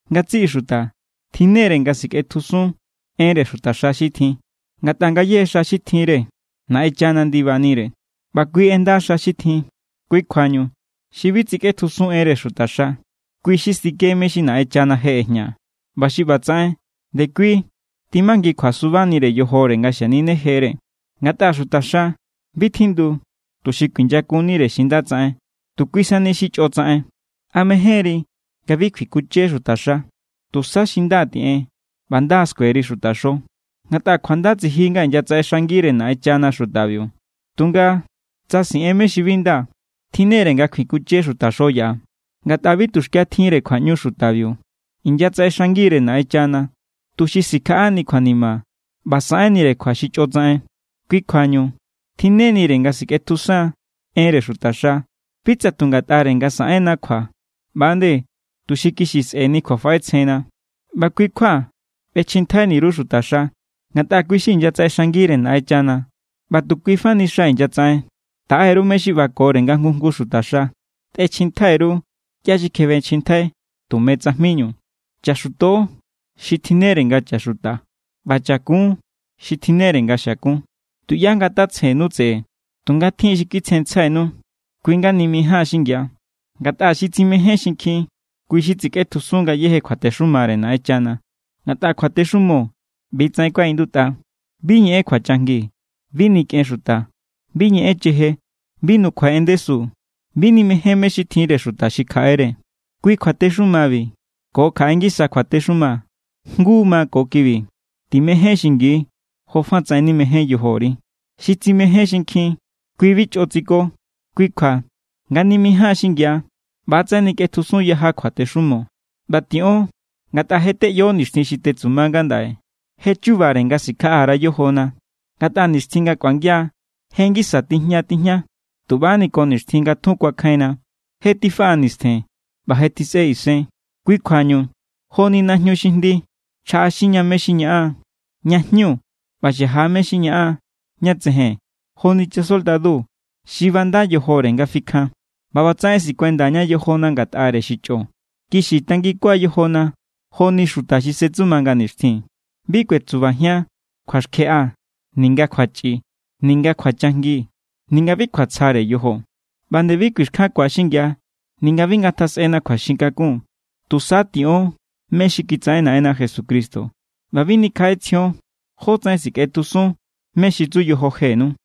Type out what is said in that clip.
Ngatsiꞌi xuta tjinnere nga sikꞌetjusun enre xutaxa xi tjin. Ngatꞌa ngayéje xa xi tjinre Naꞌenchana ndibanire, ꞌba kui ꞌenda xa xi tjin. Kui kjuañu xi bi tsikꞌetjusun enre xutaxa, kui= xi stike mé= xi Naꞌenchana je ꞌejña. ꞌBa xi ꞌbatsaꞌen, ndekui tjimangikjua subanire yojore nga xaninejere. Ngatꞌa xutaxa bi tjindu tuxi kuinyakunnire xi nda tsaꞌen, tu kui sani xi chꞌo tsaꞌen. ¿A mejénri nga bi kjuinkunche xutaxa? Tusa xi nda tiꞌen, ꞌba nda= skueri xutaxo. Ngatꞌa kjuanda tsiji nga inyatsaꞌexangire Naꞌenchana xutabiu. Tunga tsa siꞌen mé= xi bi nda, tjinnere nga kjuikunche xutaxo yaꞌa. Ngatꞌa bi tuxkia tjinre kjuaꞌñu xutabiu. Inyatsaꞌexangire Naꞌenchana, tuxi sikjaꞌani kjuanima ꞌba saꞌenire kjua xi chꞌo tsaꞌen. Kui kjuañu tjinnenire nga sikꞌetjusan enre xutaxa. Bi tsa tu ngatꞌare nga saꞌenna kjua ꞌba=nde tuxi kixi sꞌe̱ni kjuafaꞌetsjenna. ꞌBa kui kjua ꞌbechjintjaini_ru xutaxa, ngatꞌa kui inyatsaꞌexangire Naꞌenchana ꞌba tu kuifa ni xa inyatsaꞌen. Taꞌe_ru mé= xi ꞌbakore nga jngu jngu xutaxa. Tꞌechjintjai_ru ꞌya xi kjebechjintjai tume tsajminu. Chaxuto xi tjinnere nga chaxuta, ꞌba chakun xi tjinnere nga xiakun. Tuꞌyá ngatatsjennu tseꞌe. Tunga tjin xi kitsjensjainu. Kui= nga nimijáan xingia. Ngatꞌa xi tsimején xinkjin, kui= xi titsikꞌetjusun ngayéje kjuatexumare Naꞌenchana. Ngatꞌa kjuatexumo ꞌbi=tsaꞌen kuaꞌindutꞌa: “Bi ñeꞌen kjuachajngi. Bi nikꞌen xuta. Bi ñeꞌen cheje. Bi nukjuai en ndesu. Bi nimején mé= xi tjinre xuta xi kjaꞌere.” Kui kjuatexumabi ko kjaꞌe ngisa kjuatexuma jngu ma ko kibi: “Timején xingi jofatsaꞌen nimején yojori.” Xi tsimején xinkjin, kui bi chꞌo tsiko. Kui kjua nga nimijáan xingia ꞌbatsaꞌen nikꞌetjusun yaja kjuatexumo. ꞌBa tiꞌon ngatꞌa je teꞌyo nixtjin xi tetsuma ngandaꞌe. Je= chubare nga sikjaꞌa_ra yojona. Ngatꞌa nixtjin nga kꞌuangia je ngisa tiña tijña tuꞌbani ko nixtjin nga tjun kuakjainna. Je tifaꞌa nistjen, ꞌba je tjisꞌe isen. Kui kjuañu joni najñu xi jndi chjaꞌaxinña mé= xi ñaꞌan ña jñu ꞌba xaja mé= xi ñaꞌan ña tsejen joni chasoldadu xi banda yojore nga fikjan. ꞌBa ꞌbatsaꞌen sikuendaña yojona ngatꞌare xi chꞌo. Kixi tanginkua yojona joni xuta xi setsuma nga nixtjin. Bi kꞌuetsubajian kjuaxkjeꞌa ninga kjuachꞌi ninga kjuachajngi ninga bi kjuatsjare yojo. ꞌBa nde bi kuixkjankua xingia ninga bi ngatjasꞌena kjuaxin kakun. Tusa tiꞌon mé= xi kitsaꞌen Naꞌenna Jesucristo, ꞌba bi nikjaꞌetsjion jótsaꞌen sikꞌetjusun mé= xi tsu yojo jenu.